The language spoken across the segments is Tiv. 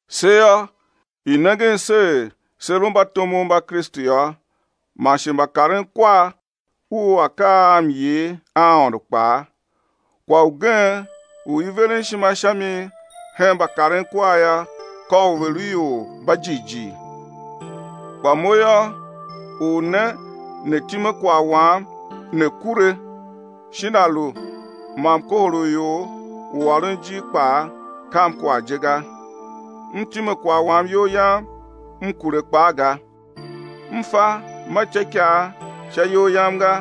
Se yô, i̱ nengen se er se lu mbatomov mba Kristu yô, man shi mbakarenkwar u akaa a myer a Aôndo kpaa. Kwagh ugen u i veren ishima sha mi hen mbakarenkwar yô, ka u ve̱ lu ior mba jighjigh. Kpa mo yô, u ne né time kwagh wam né kure, shin a lu ma mkohol u ior u ôron ijir kpaa, kam kwagh je ga. M time kwagh wam iyol yam, m kure kpaa ga. M fa ma ityôikaa sha iyol yam ga,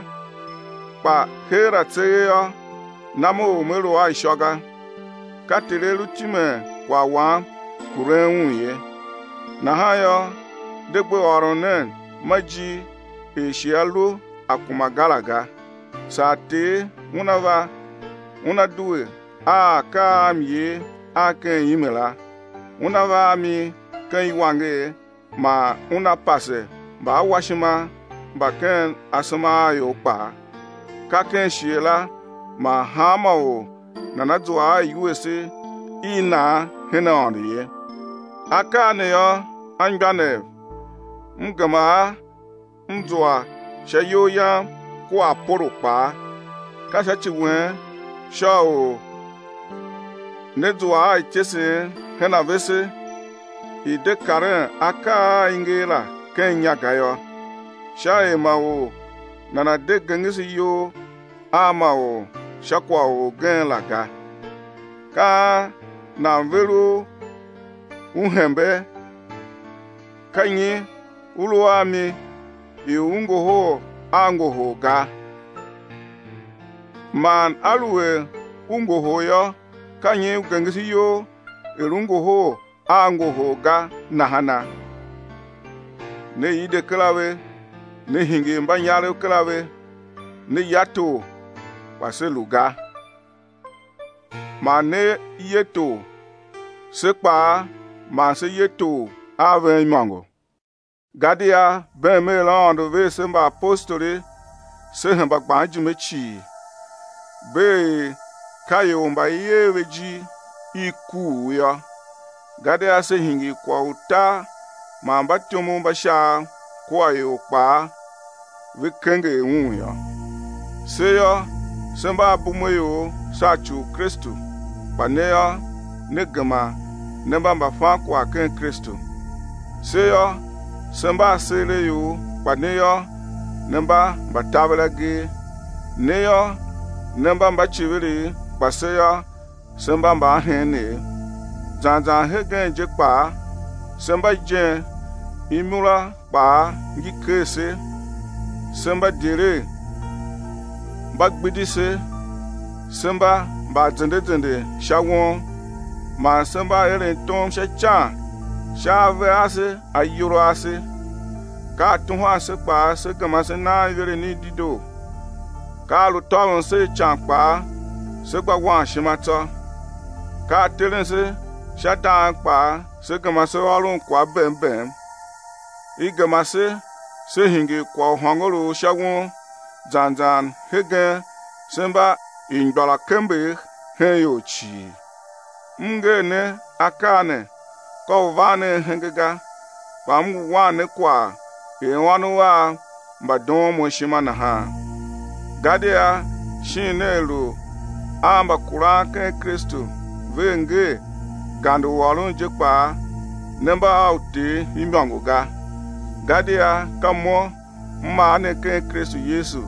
kpa heera tseegh yô, nam u me lu a ishô ga. Ka Ter A lu timen kwagh wam, kuren un ye. Nahan yô, de gbe ôron nen ma ijir er shighe a lu a kuma ga la ga, saa Ter Una va Una due a akaa a myer a ken ime la, Una va a mi ken iwanger, man Una pase mbaawashima mba ken asema a ior kpaa, ka ken shighe la man hanma or nana zua a iwuese i nan hen Aôndo ye. Akaa ne yô, anmgbianev, m gema a m zua sha iyol yam kua Apolo kpaa; ka sha ci wen sha u ne̱ zua a ityesen hen a vese er, i̱ de karen akaa a i nger la ken inya ga yô, sha er ma or nana̱ de gengese iyol a ma or sha kwagh u orgen la ga. Ka an nan ver u u hembee? Ka nyi u lu a mi i u ngohol a ngohol ga? Man aluer u ngohol yô, ka nyi u gengese iyol er u ngohol a ngohol ga nahana? Ne ide kera ve, ne hingir mbanyarev kera ve, ne ya tor, kpa se lu ga. Ma ne ye tor, se kpaa ma se ye tor a ven imôngo. Gadia beem er Aôndo ver se mbaapostoli se hemba gban ijime cii, bee er ka ior mba i er ve ijir i kuugh yô; gadia se hingir kwagh u tar man mbatyomov mba Shaav kua ior kpaa ve kenger un yô. Se yô, se mba abumeaior sha ci u Kristu, kpa ne yô, ne gema ne mba mbafankwagh ken Kristu. Se yô, se mba aseeraior, kpa ne yô, ne mba mbataveragee. Ne yô, ne mba mbaiciviriv, kpa se yô, se mba mbaaheenev. Zan zan hegen je kpaa, se mba ijen, imura kpaa ngi ker se, se mba idyelegh, mba gbidi se, se mba mba azende azende sha won. Man se mba eren tom sha ican sha ave ase ayol ase. Ka a tuhwan se kpaa, se gema se naan iveren i dedoo. Ka a lu tôvon se a ican kpaa, se gba wan ishima tsô; ka a teren se sha dang kpaa, se gema se ôron kwagh bem bem. I gema se se hingir kwagh u hôngorough sha won, zan zan hegen se mba ingbôrakembegh hen ior cii. M nger ne akaa ne ka u van ne ahenge ga, kpa m ngu wan ne kwagh er ônov av mba doon mo ishima nahan. Gadia shin nea lu a mbakuran ken Kristu vea ngee gande u ôron je kpaa ne mba a uter imôngo ga, gadia ka mo m mar ne ken Kristu Yesu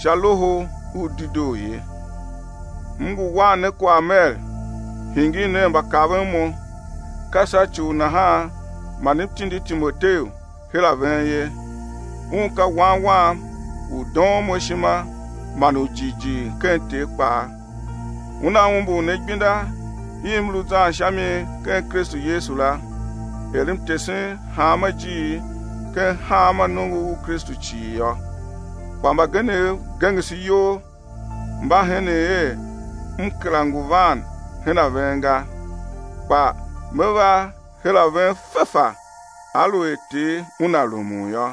sha Loho u Dedoo ye. M ngu wan ne kwagh mer: Hingir nen mbakaven mo. Ka sha ci u nahan man m tindi Timoteu her a ven ye. Un ka wan wam u doon mo ishima man u jighjigh ken Ter kpaa. Una umbur ne igbenda i m lu zan sha mi ken Kristu Yesu la, er m tesen hanma ijiir ken hanma nongo u Kristu cii yô. Kpa mbagenev gengese iyol, mba henen er m kera ngu van hen a ven ga. Kpa me va her a ven fefa, aluer Ter Una rumun yô,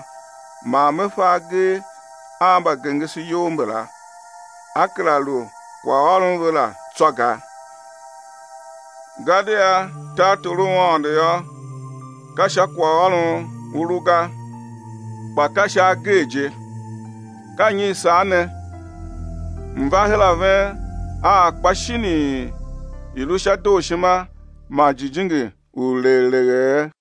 man me fa agee a mbagengeseyol mbala, á kera lu kwaghôron ve la tsô ga. Gadia tartor u Aôndo yô, ka sha kwaghôron u lu ga, kpa ka sha agee je. Ka nyi i sar ne? M̱ va her a ven a akpa shinii, i̱ lu sha dooshima man jijingi u legh leghee?